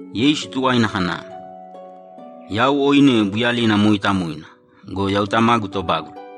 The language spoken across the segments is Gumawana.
Yeisu tuwaina kana, ‘Yau oine buyalina mooitamoina go, yau Tamagu tobágula.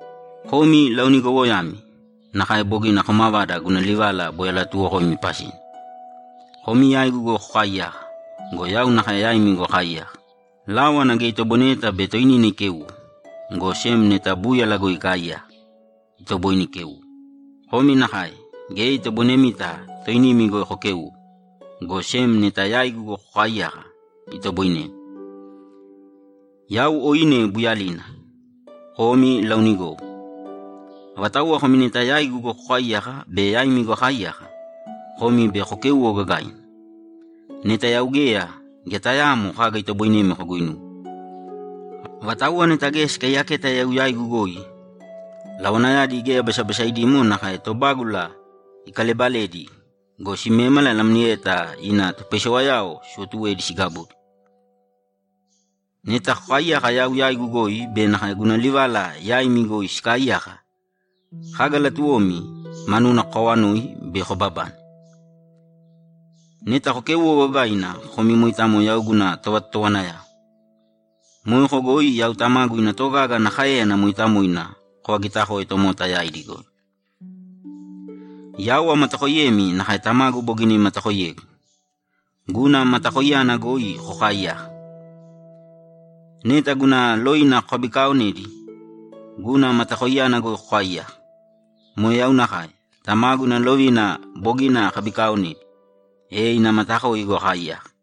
Komi laonigowoyami nakae bogina komavada guna livala boi alatuuwokoimi pasina. Komi yaigu goi kokaaiyāka go, yau nakae yaimi goi akaaiyaka. Láwana geya itoboineyeta bei toinina ikéuwo, go sem neta búyala goi ikaaiyaka, itoboine ikéuwo. Komi nakae, geya itoboinemita toinimi goi kokéuwo, go sem neta yaigu goi kokaaiyaka, itoboinemi. Yau oine buyalina. Komi laonigowo. Avatauwa komi neta yaigu goi kokaaiyaka be yaimi goi akaaiyaka, komi bei kokéuwo gagaina. Neta yau geya, geya tayaamo kaga itoboinemi koguinuwe. Avatauwa neta geya sikaiyaketa yau yaigu goi, lawanayadi geya basabasaidimo nakae tobágula ikalebaledi go, simémala namlieta ina topaisewayao siwotuwedi sigabudi. Neta kokaaiyaka yau yaigu goi be nakae guna livala yaimi goi sikaaiyaka, kaga latuwomi, manuna kokawanōi, bei kobabane. Neta kokéuwo gagaina, komi moitamo yau guna tovatotowanayao. Moeko goi yau Tamagu ina togaga ana káeyana mooitamoina kovagitakoe tomota yaidi goi. Yau amatakoiyemi nakae Tamagu bogina imatakoiyegu. Guna matakoiyana goi kokaaiyāka. Neta guna lovina kokabikaaonedi, guna matakoiyana goi kokaaiyaka. Moe yau nakae; Tamagu ina lovina bogina akabikaonedi, e ina matakoi goi akaaiyaka.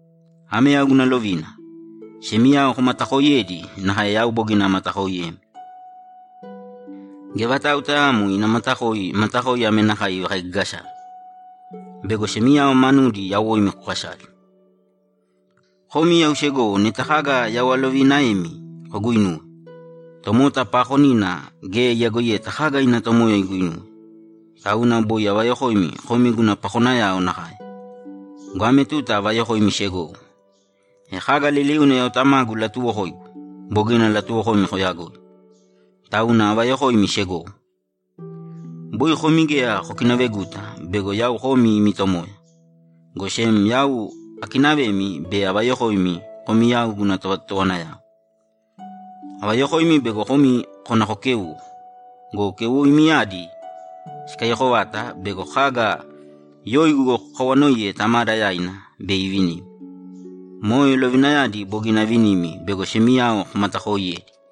Ame yau guna lovina: Semiyao komatakooiyēdi nakae yau bogina amatakooiyemi. Geya vatau tayaamo ina matakoi matakoi ame nakae ivakaigagasave: Bego semiyao manudi yawoimi kokasale. Komi yau segowo neta kaga yau aloviinaemi koguinuwe. Tomota paakonina geya iyagoiyeta kaga ina tomoya iguinuwe, tauna boi avayokoimi komi guna pakonayao nakae go, ame tuta avayokoimi segowo. E kaga liliuna yau Tamagu ilatuuwokoigu, bogina alatuwokoimi koyagoi, tauna avayokoimi segowo. Boi komi geya kokinaveguta bego yau komi imi Tomoya, go sem yau akinavemi be avayokoimi komi yau guna tovatotowanayao. Avayokoimi bego komi kona kokéuwo go, keuwoimiyadi sikaiyako vata bego kaga yoigu goi kokawanoiye Tamada yaina, bei ivinimi. Moe lovinayadi bogina avinimi bego semiyao komatakooiyēdi.’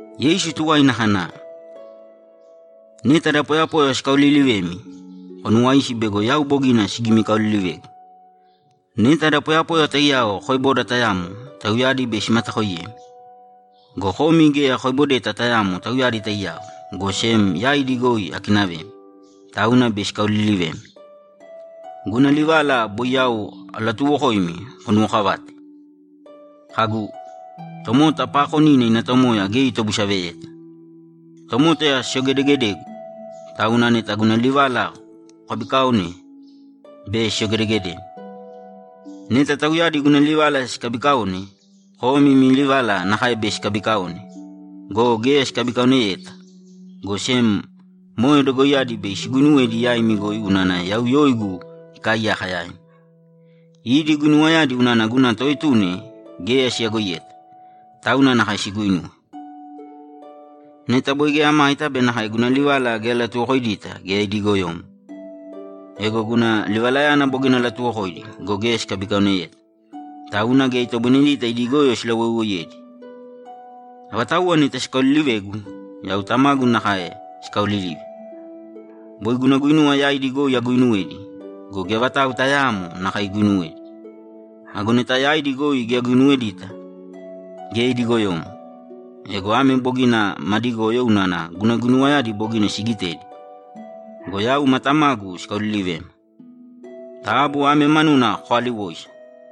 Yeisu tuwaina kana, ‘Neta da poyapoya sikaoliilivemi, konuwāisi bego yau bogina sigimikaolilivegu. Neta da poyapoya taiyao koeboda tayamo, tauyadi bei simatakoiyemi. Go komi geya koebodeta tayamo tauyadi taiyao, go sem yaidi goi akinavemi, tauna bei sikaolilivemi. Guna livala boi yau alatuuwokoimi konuwokavāte, kagu, “Tomota paakonina ina tomoya geya itobusaveyeta.” Tomota siyogedegedegu, tauna neta guna livala kokabiikaone, bei siyogedegedemi. Neta tauyadi guna livala sikabikaone, komi imi livala nakae bei sikabikaone go, geya sikabikaoneyeta, go sem moe dogoiyadi bei siguinuwedi yaimi goi unana yau yoigu ikaaiyaka yaimi. Idi guinuwayadi unana guna Toetuna geya siyagoiyeta, tauna nakae siguinuwe. Neta boi geya amaita be nakae guna livala geya alatuwokoidita, geya idi goyomo. Ego guna livalayana bogina alatuwokoidi go, geya sikabikaoneyeta, tauna geya itoboinedita idi goyo silawoiwoiyedi. Avatauwa neta sikaoliilivegu, yau Tamagu nakae sikaoolilive. Boi guna guinuwa yaidi goi aguuinuwedi go, geya vatau tayaamo nakae iguinuwedi. Ago neta yaidi goi geya aguinuwedita, geya idi goyomo. Ego ame bogina madi goyo unana guna guinuwayadi bogina sigitedi go, yau ma Tamagu sikaolilivema. Taabu ame manuna kokaaliwōisa.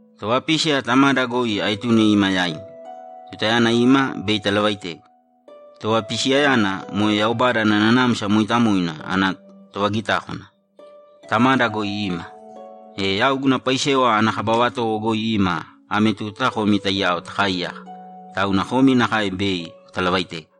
Tovapísiya Tamada goi aetune ima yaimi. Tutayana ima, bei italavaitegu. Tovapisiyayana, moe Yaubada ana Nanamsa Mooitamoina ana tovagitákwana, Tamada goi ima. E yau guna paisewa ana kaba vatowo goi ima ame tuta komi taiyao takaaiyaka, tauna komi nakae bei kotalavaitegu.’